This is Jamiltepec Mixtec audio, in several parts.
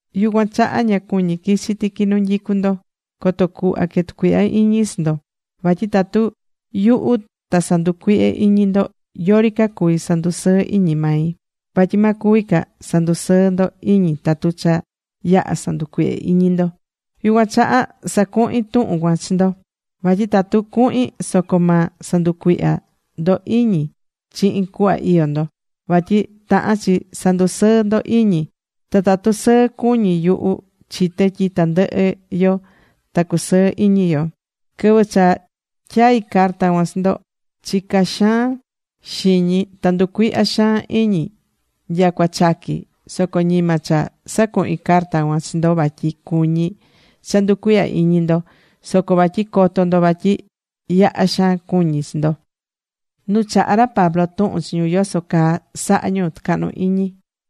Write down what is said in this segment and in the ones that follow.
Yucuan chaha ña cuñí quichi tiqui nu nyicu ndo coto cuhva que tucuihya iñi chi ndo. Vatyi tatu yuhu ta sanducuihyé iñi ndo, yori ca cuví sandusɨɨ iñi mai. Vatyi ma cuvi ca sandusɨɨ ndo iñi tatu cha yaha̱ sanducuihye̱ iñi ndo. Yucuan chaha sacuhi̱n tuhun cuan chi ndo. Vatyi tatu cuhin soco ma sanducuihya ndo iñi chihin cuhva iyó ndo. Vatyi tahán chi sandusɨɨ́ ndo iñi. Ta tatu sɨɨ cuñí yuhu, chité tyi tandɨhɨ yo ta cusɨɨ iñi yo. Quɨvɨ cha tyai̱ carta cuan chi ndo, chica̱ xaan xiñi. Ta nducuihya̱ xaan iñi nyacua chaqui̱. Soco ñima cha sacuhi̱n carta cuan chi ndo vatyi cuñí cha nducuihya iñi ndo. Soco vatyi coto ndo vatyi yaha xaan cuñí chi ndo.Nu chahá ra Pablo tuhun chi ñu yoso caa saha ñu tɨcahnu iñi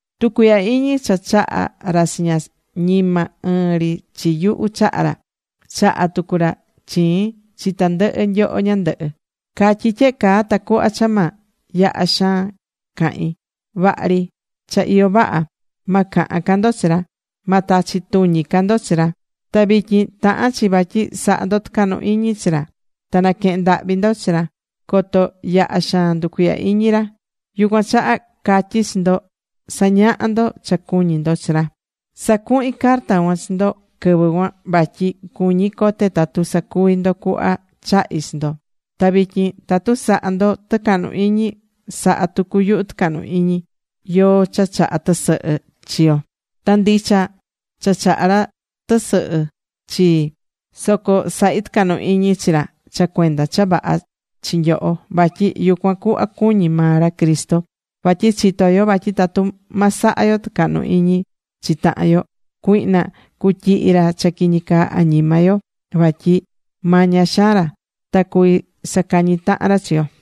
Tucuihya iñi cha chaha̱ ra chiña, ñima ɨɨn ri chi yuhu chaha̱ ra. Chaha̱ tucu ra chiin chi tandɨhɨ nyoho ñandɨhɨ. Catyí tyehe caa tacuhva cha ma yaha xaan cahín. Vaha ri, cha iyó vaha. Ma cahan ca ndo chi ra. Ma tachi tuñi ca ndo chi ra. Ta vityin tahán chi vatyi saha ndo tɨcahnu iñi chi ra. Ta naquehén ndahvi ndo chi ra, coto yaha xaan nducuihyá iñi ra. Yucuan chaha catyí chi ndo sa̱ñaha ndo cha cuñí ndo chi ra. Sacuhi̱n carta cuan chi ndo quɨvɨ cuan vatyi cuñí cote tatu sacuví ndo cuhva chahí chi ndo. Ta vityin tatu sahá ndo tɨcahnu iñi, sahá tucu yuhu tɨcahnu iñi yóó cha chahá tɨsɨhɨ chi yo. Tatu ndicha cha chahá ra tɨsɨhɨ chii. Soco sahí tɨcahnu iñi chi ra cha cuenda cha vaha chi nyoho. Vatyi yucuan cuhva cuñí maa ra Cristo. Vatyi chitó yo vatyi tatu ma saha yo tɨcahnu iñi chi tahan yo, cuihna cutyihi ra cha quiñi caa añima yo. Vatyi maña xaan ra. Ta cuví sacañi tahan ra chi yo.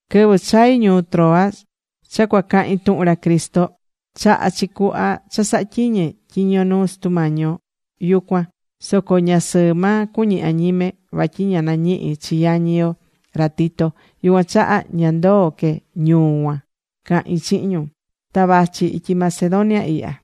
Quɨvɨ chai̱ ñuu Troas cha cuacahin tuhun ra Cristo, chahá chi cuhva cha sahá tyiñe tyiño nuu Sutu Mañi yo yucuan. Soco ña sɨɨ maa cuñi̱ añime. Vatyi ña nañihi̱ chi yañi yo, ra Tito. Yucuan chaha ña ndoo̱ que ñuu cuan cahin chihin ñu. Ta vachi ityi Macedonia ihya.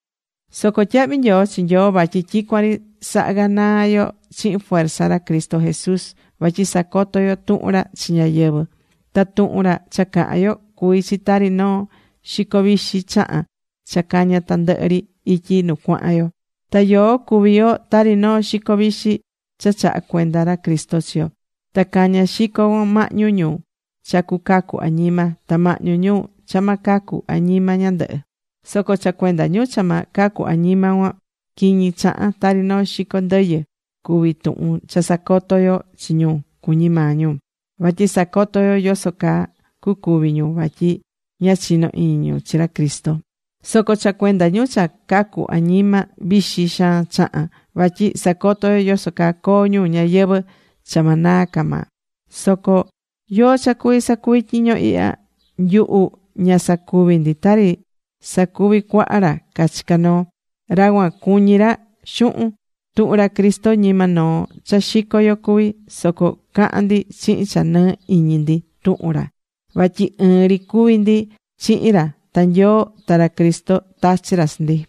Soco tyahvi nyoo chi Nyoo vatyi tyicuan ri sahá ganaa yo chihin fuerza ra Cristo Jesús. Vatyi sacotó yo tuhun ra chi ñáyɨvɨ. Ta tuhun ra cha cahán yo, cuví chi tari noo xico vixi chahan cha cañá tandɨhɨ ri ityi nu cuahán yo. Ta yoó cuví yo tari noo xico vixi cha chahá cuenda ra Cristo chi Nyoo. Ta cañá xico cuan mahñu ñu cha cucacu añima, ta mahñu ñu cha ma cacu añima ñandɨhɨ. Soco cha cuenda ñu cha ma cacu añima cuan, quiñi chahán, tari noo xico ndɨyɨ cuví tuhun cha sacotó yo chi ñu, cuñí maa ñu. Vatyi sacotó yo yoso caa cucuvi ñu vatyi ña chinó iñi ñu chi ra Cristo. Soco cha cuenda ñu cha cacú añima, vixi xaan chahán, Vatyi sacotó yo yoso caa coo ñu ñayɨvɨ̱ cha ma naa ca maa. Soco ¿yóó cha cuví sacuvi tyiño ihya? Nyuhu ña sacuví ndi tari sacuví cuaha ra cachicá noo. Ra cuan cuñí ra xuhun. Tuhun ra Cristo ñima noo cha xicó yo cuví. Soco cahán ndi chihin cha nɨɨ iñi ndi tuhun ra vatyi ɨɨn ri cuví ndi chihin ra, ta Nyoo ta ra Cristo tachi̱ ra chi ndi.